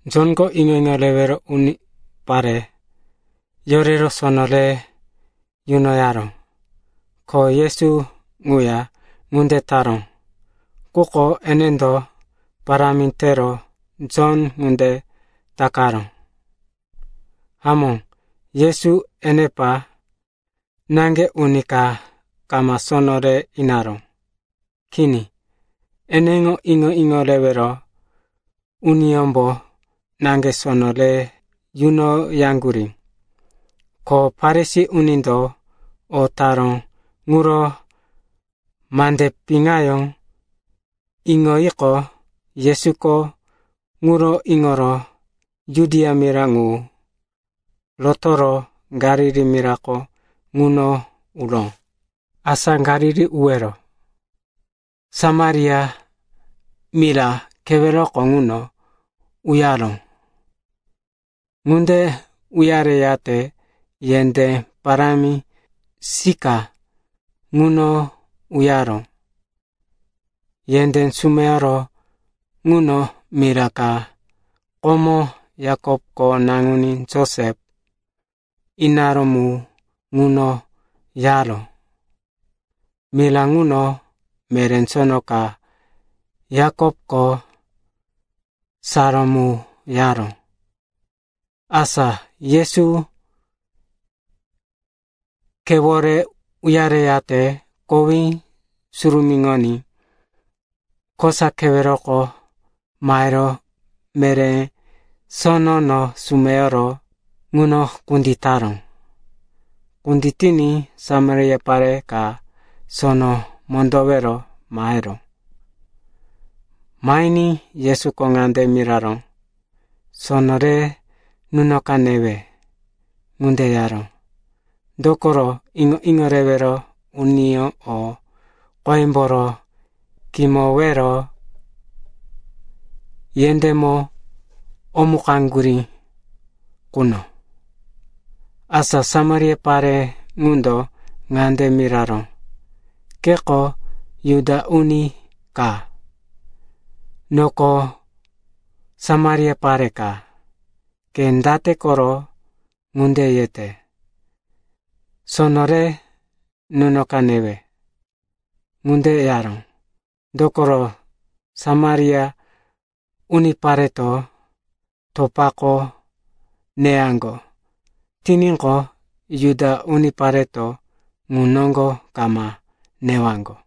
Jonko iŋo-iŋo rewero unipare yorero sono re yunoyaró, ko Yesu ŋuya ŋunde taró, quko enendo parámi tero Jon ŋunde takaró. (Hamó, Yesu enepa naŋge uni ka kama sono re inaró. Kini. Eneŋo iŋo-iŋo rewero uniyómbo naŋge sono re yunoyaŋgurí.) Ko Farisi unindo o taró ŋuro mande piŋayó iŋoyiqo, Yesuko ŋuro iŋoro Judia mira ŋu rotoro Galili mirako ŋuno uró. Asa Galili urowero Samaria mira keweroko ŋuno uyaró. Ŋunde uyareyate yendé parámi Sika ŋuno uyaró. Yendé sumeyoro ŋuno mira ka komo Yakopko naŋuní Josep inaró mu ŋuno yaró. Mira ŋuno meré sono ka Yakopko saró mu yaró. Asa Yesu khewore uyareyate kowí surumíŋoní kosa keweroko mahero meré sono sumeyoro ŋuno kunditaró. Kunditiní Samaria pare ka sono mondowero maheró. Mahiní Yesuko ŋande miraró, “Sono re nunoka newe.” (Ŋunde yaró, dokoro iŋo-iŋo rewero uniyó o qoyemboro kimowero yendémo omukaŋgurí quno.) Asa Samaria pare ŋundo ŋande miraró, “Keko Juda uni ka, noko Samaria pare ka. Ke date koro ŋunde yete, ‘Sono re nunoka, newe?’” (Ŋunde yaró, dokoro Samaria unipareto topako neyaŋgo tiníqo, Juda unipareto ŋu noŋgo kama newaŋgo.)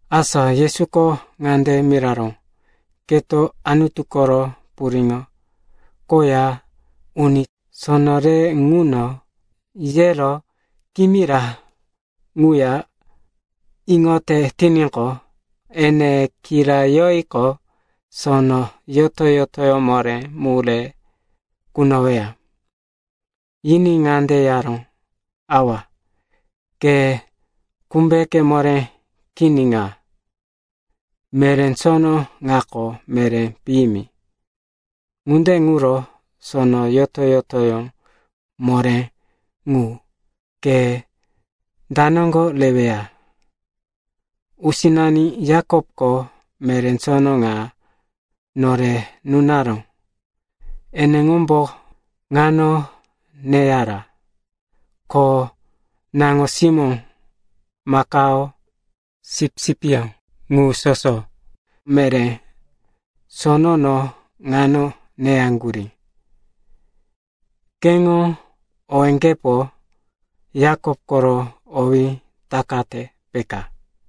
Asa Yesuko ŋande miraró, “Keto Anutu koro puriŋo koya uni, sono re ŋuno yero kimira ŋuya iŋote tiníqo, ene kirayoyiqo, sono yoto-yotoyó moré mu re kunoweya.” Yiní ŋande yaró, “Awa, ke kumbeke moré kini ŋa! Meré sono ŋako meré piyimi. Ŋunde ŋuro sono yoto-yotoyó moré ŋu, ke da noŋgo reweya? Usinani Yakopko meré sono ŋa nore nunaró. Eneŋombo ŋano neyara, ko naŋo-simó, makao, sipsipyó ŋu soso meré sonono ŋano neyaŋgurí. Keŋo owéŋgepo Yakop koro owí takate, peka?”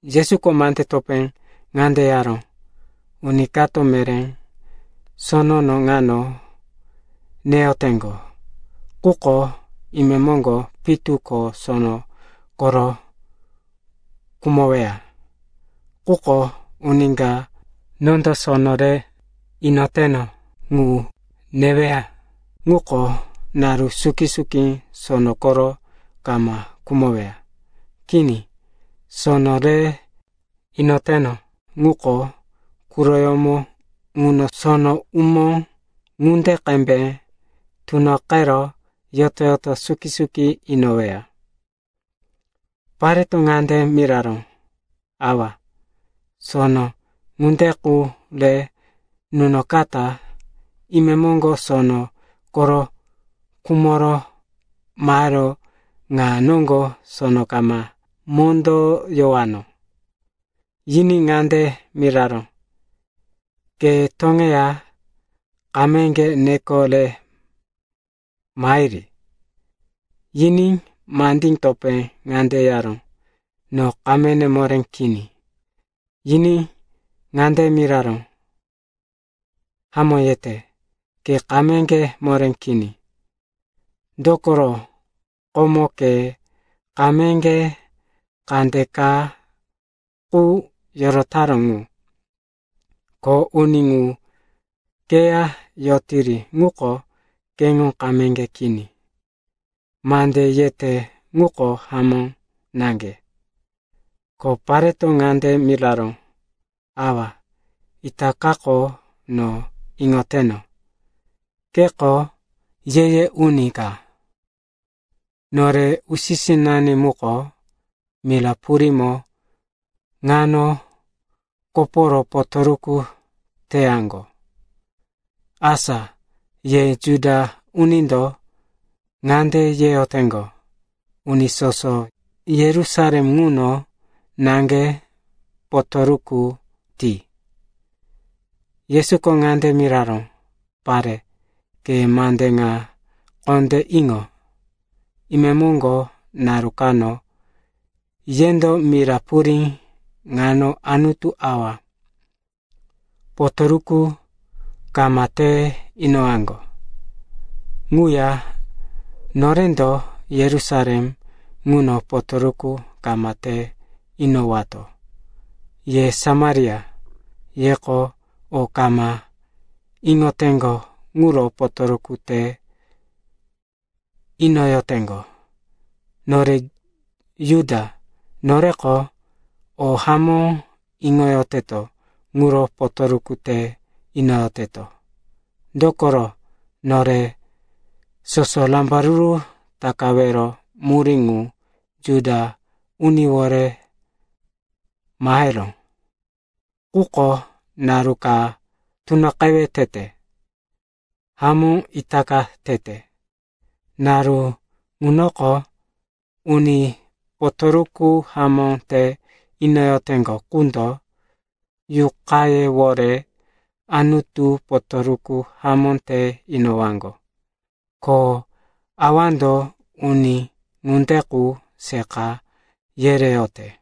Yesuko mande topé ŋande yaró, “Uni kato meré sonono ŋano neyoteŋgo, quko imemoŋgo pitu ko sono koro khumoweya. Quko uni ka nondo sono re inoteno ŋu neweya ŋuko naru suki-suki sono koro kama khumoweya. Kini, sono re inoteno ŋuko quroyómo ŋuno sono umó ŋunde qembe tunoqero yoto-yoto suki-suki inoweya.” Pareto ŋande miraró, “Awa, sono ŋunde qu re nunokata imemoŋgo sono koro khumoro mahero ŋa noŋgo sono kama mondoyowano.” Yiní ŋande miraró, “Ke toŋeya kameŋge neko re mahiri.” Yiní mande topé ŋande yaró, “No kamene moré kini.” Yiní ŋande miraró, “Hamó yete, ke kameŋge moré kini, dokoro komo ke kameŋge kandeka qu yorotaró ŋu. Ko uni ŋu keya yotiri ŋuko, keŋo kameŋge kini. Mande yete ŋuko hamó naŋge.” Ko pareto ŋande miraró, “Awa, itakako no iŋoteno, keko ye-ye uni ka. Nore usi-sinani muko mira purímo ŋano koporo potoruku teyaŋgo. Asa ye Juda unindo ŋande yeyoteŋgo, uni soso Yerusalem ŋuno naŋge potoruku ti.” Yesuko ŋande miraró, “Pare, ke mande ŋa kondé iŋo. Imemoŋgo naru kano yendo mira purí ŋano Anutu Awa potoruku kama te inowaŋgo. Ŋuya norendo Yerusalem ŋuno potoruku kama te inowato. Ye Samaria, yeko o kama iŋoteŋgo ŋuro potoruku te inoyoteŋgo. Nore Juda, noreko o hamó iŋoyoteto ŋuro potoruku te inoyoteto. Dokoro nore soso rambaruru takawero murí ŋu Juda uniwore maheró. Quko naru ka tunoqewe tete, hamó itaka tete. Naru ŋunoko uni potoruku hamó te inoyoteŋgo qundo yuqayewore Anutu potoruku hamó te inowaŋgo. Ko Awando uni ŋunde qu seqa yereyote.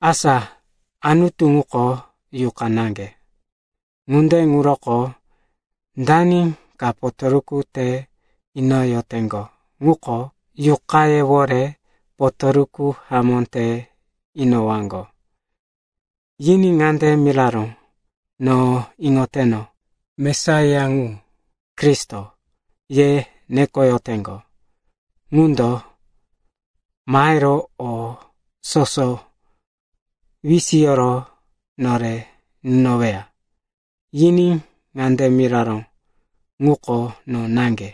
Asa Anutu ŋuko yuqa naŋge. Ŋunde ŋuroko dani ka potoruku te inoyoteŋgo ŋuko yuqayewore potoruku hamó te inowaŋgo.” Yiní ŋande miraró, “No iŋoteno. Mesaiya ŋu, ‘Kristo,’ ye nekoyoteŋgo, ŋundo mahero o soso wisiyoro nore nunoweya.” Yiní ŋande miraró, “Ŋuko no naŋge,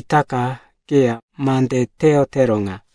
itaka keya mande teyotero ŋa!”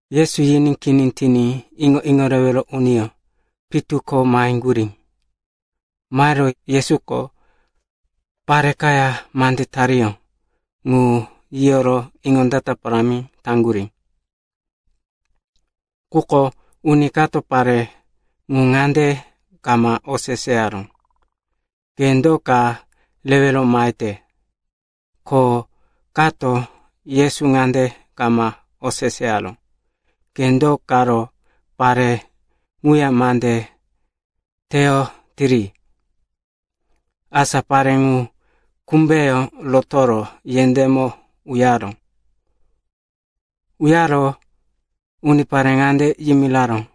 Yesuko yiní kini tiní iŋo-iŋo rewero uniyó pitu ko maheŋgurí. Mahero, Yesuko pare kaya mande tariyó ŋu yiyoro iŋondata parámi taŋgurí. Quko uni kato pare ŋu ŋande kama oseseyaró, “Ke do ka rewero mahete?” ko kato Yesu ŋande kama oseseyaró, “Ke do karo pare ŋuya mande teyotiri?” Asa pare ŋu kumbeyó rotoro yendémo uyaró. Uyaro unipare ŋande yimiraró,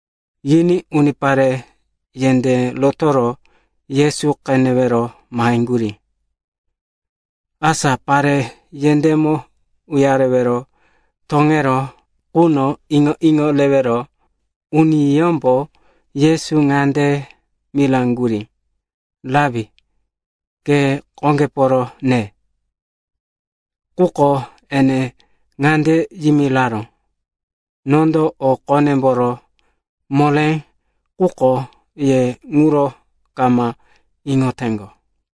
Yiní unipare yendé rotoro Yesu qenewero maheŋgurí. Asa pare yendémo uyarewero toŋeró quno iŋo-iŋo rewero uniyómbo Yesu ŋande miraŋgurí, “Rapi, ke qoŋgeporo ne.” Quko ene ŋande yimiraró, “Nondo o qonemboro moré quko ye ŋuro kama iŋoteŋgo.”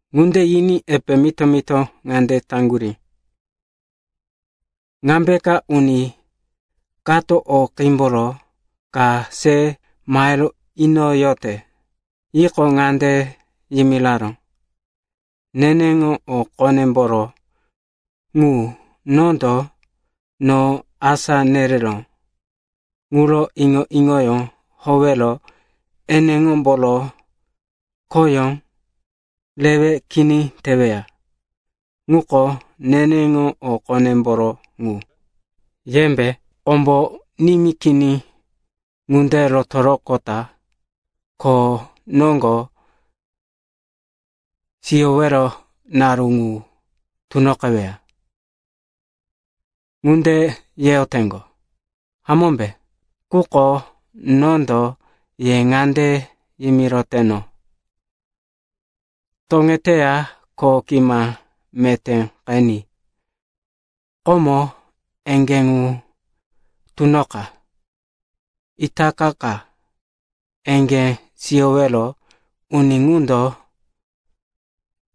Ŋunde yiní epe mito-mito ŋande yaŋgurí, “Ŋambeka uni kato o qímboro ka se mahero inoyote?” Yiqo, ŋande yimiraró, “Neneŋo o qonemboro ŋu, nondo no asá nereró ŋuro iŋo-iŋoyó howero eneŋomboro khoyó rewe kini teweya, ŋuko neneŋo o qonemboro ŋu. Yembe, ‘Kombo nimí kini ŋunde rotoroqota kho noŋgo siyowero naru ŋu tunoqeweya,’ ŋunde yeyoteŋgo, hamómbe? Quko nondo ye ŋande yimiroteno, ‘Toŋeteya kho gima meté qeni. Komo eŋgé ŋu tunoqa.’ Itaka ka eŋgé siyowero uni ŋundo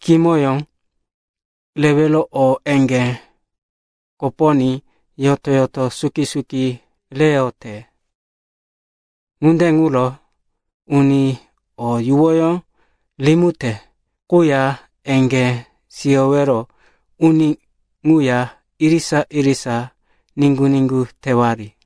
kimoyó rero o eŋgé koponí yoto-yoto suki-suki reyote. Ŋunde ŋuro uni o yuwoyó rimite quya eŋgé siyowero uni ŋuya irisa-irisa niŋgu-niŋgu tewari.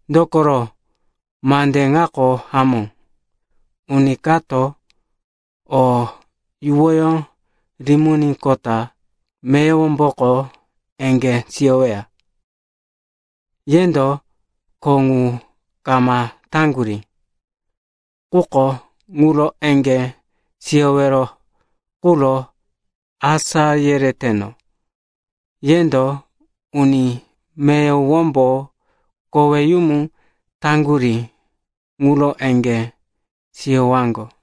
Dokoro mande ŋako hamó, ‘Uni kato o yuwoyó riminíqota meyowomboko eŋgé siyoweya.’ Yendo kho ŋu kama taŋgurí, quko ŋuro eŋgé siyowero quro asá yereteno. Yendo uni meyowombo koweyumu taŋgurí ŋuro eŋgé siyowaŋgo.”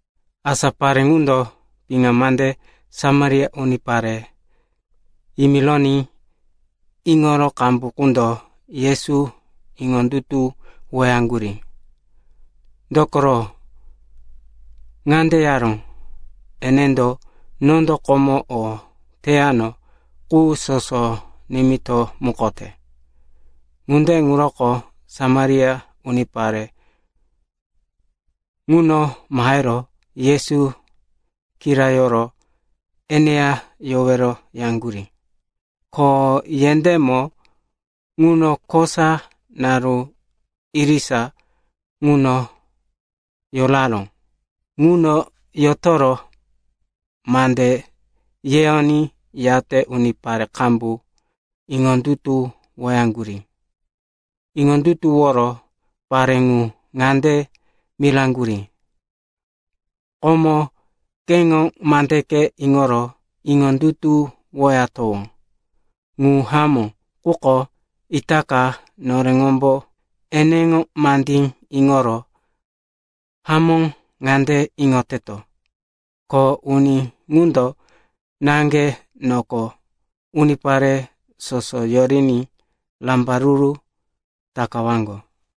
Asa pare ŋundo piŋa mande Samaria unipare yimironí iŋoro qambu qundo Yesu iŋondutuwoyaŋgurí. Dokoro, ŋande yaró, “Enendo nondo komo o teyano qu soso nimitomukote.” Ŋunde ŋuroko Samaria unipare ŋuno mahero Yesu kirayoro eneya yowero yaŋgurí. Ko yendémo ŋuno kosa naru irisa ŋuno yoraró. Ŋuno yotoro mande yeyoní, yate unipare qambu iŋondutuwoyaŋgurí. Iŋondutuworo pare ŋu ŋande miraŋgurí, “Komo keŋo mandeke iŋoro iŋondutuwoyatowó. Ŋu hamó quko itaka noreŋombo eneŋo mandí iŋoro hamó ŋande iŋoteto, ko uni ŋundo naŋge noko unipare soso yoriní rambaruru takawaŋgo.”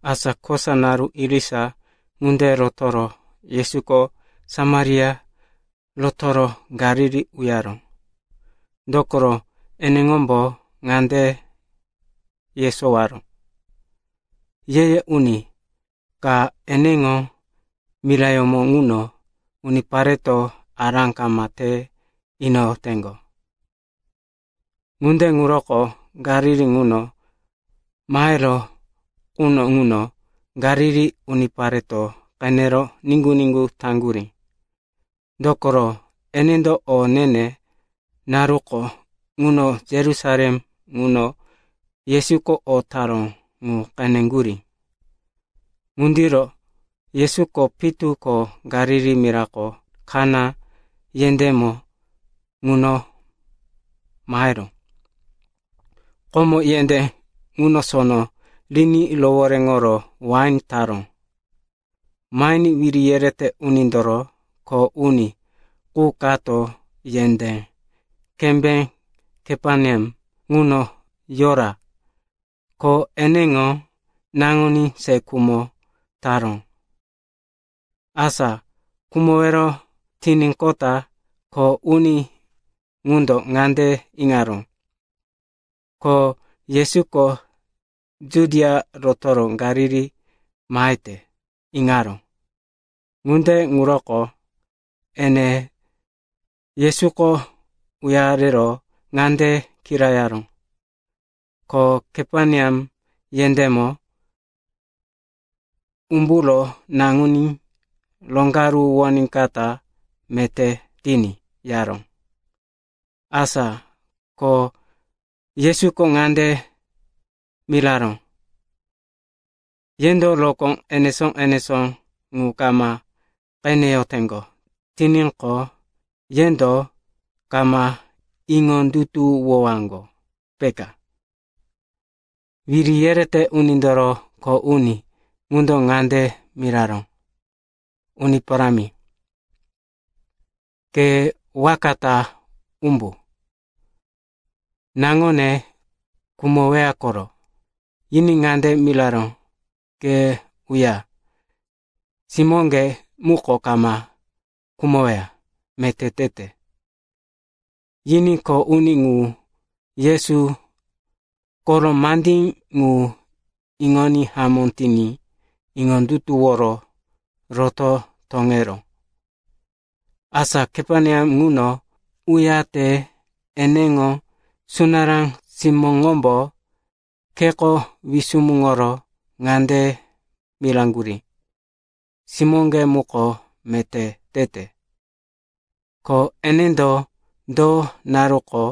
Asa kosa naru irisa ŋunde rotoro Yesuko Samaria rotoro Galili uyaró. Dokoro eneŋombo ŋande yesowaró, “Ye-ye uni ka, eneŋo mirayómo ŋuno unipareto ará kama te inoyoteŋgo.” Ŋunde ŋuroko Galili ŋuno maheró quno ŋuno Galili unipareto qenero niŋgu-niŋgu taŋgurí, dokoro enendo o ne-ne naruko ŋuno Yerusalem ŋuno Yesuko o taró ŋu qeneŋgurí. Ŋundiro Yesuko pitu ko Galili mirako Kana yendémo ŋuno maheró. Komo yendé ŋuno sono riní rohoréŋoro wain taró. Mahiní wiri yerete unindoro kho uni qu kato yendé kembé Kaperneam ŋuno yora, ko eneŋo naŋuní se khumo taró. Asa khumowero tiníqota kho uni ŋundo ŋande iŋaró, ko Yesuko Judia rotoro Galili mahete, iŋaró. Ŋunde ŋuroko ene Yesuko uyarero ŋande kirayaró, ko Kaperneam yendémo umburo naŋuní roŋgaruwoníkata meté tiní, yaró. Asa ko Yesuko ŋande miraró, “Yendo rokó enesó-enesó ŋu kama qeneyoteŋgo tiníqo, yendo kama iŋondutuwowaŋgo, peka.” Wiri yerete unindoro kho uni ŋundo ŋande miraró, “Uni Parámi, ke waka ta umbu, naŋone khumoweya koro.” Yiní ŋande miraró, “Ke uya, simóŋge muko kama khumoweya, meté tete.” Yiní kho uni ŋu Yesu koro mandí ŋu iŋoní hamó tiní iŋondutuworo roto toŋeró. Asa Kaperneam ŋuno uyate eneŋo sunará simóŋombo kheko wisumuŋoro ŋande miraŋgurí, “Simóŋge muko meté tete.” Ko enendo, do naruko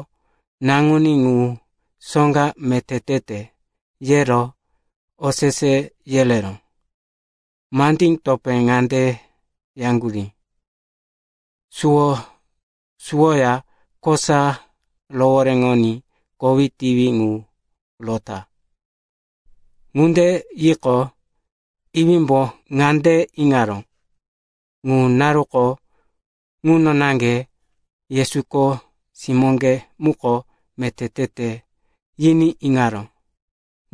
naŋuní ŋu soŋga meté tete, yero osese yereró. Mandí topé ŋande yaŋgurí, “Suwo suwoya kosa rohoréŋoní kowí tiwi ŋu rota.” Ŋunde yiqo, iwímbo ŋande iŋaró, ŋu naruko ŋuno naŋge Yesuko, “Simóŋge muko meté tete,” yiní iŋaró.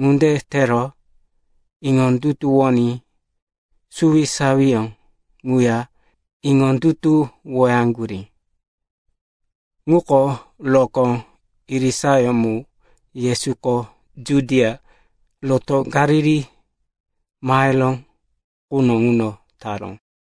Ŋunde tero iŋondutuwoní suwisawiyó ŋuya iŋondutuwoyaŋgurí. Ŋuko rokó irisayó mu Yesuko Judia rotoro Galili maheró quno ŋuno taró.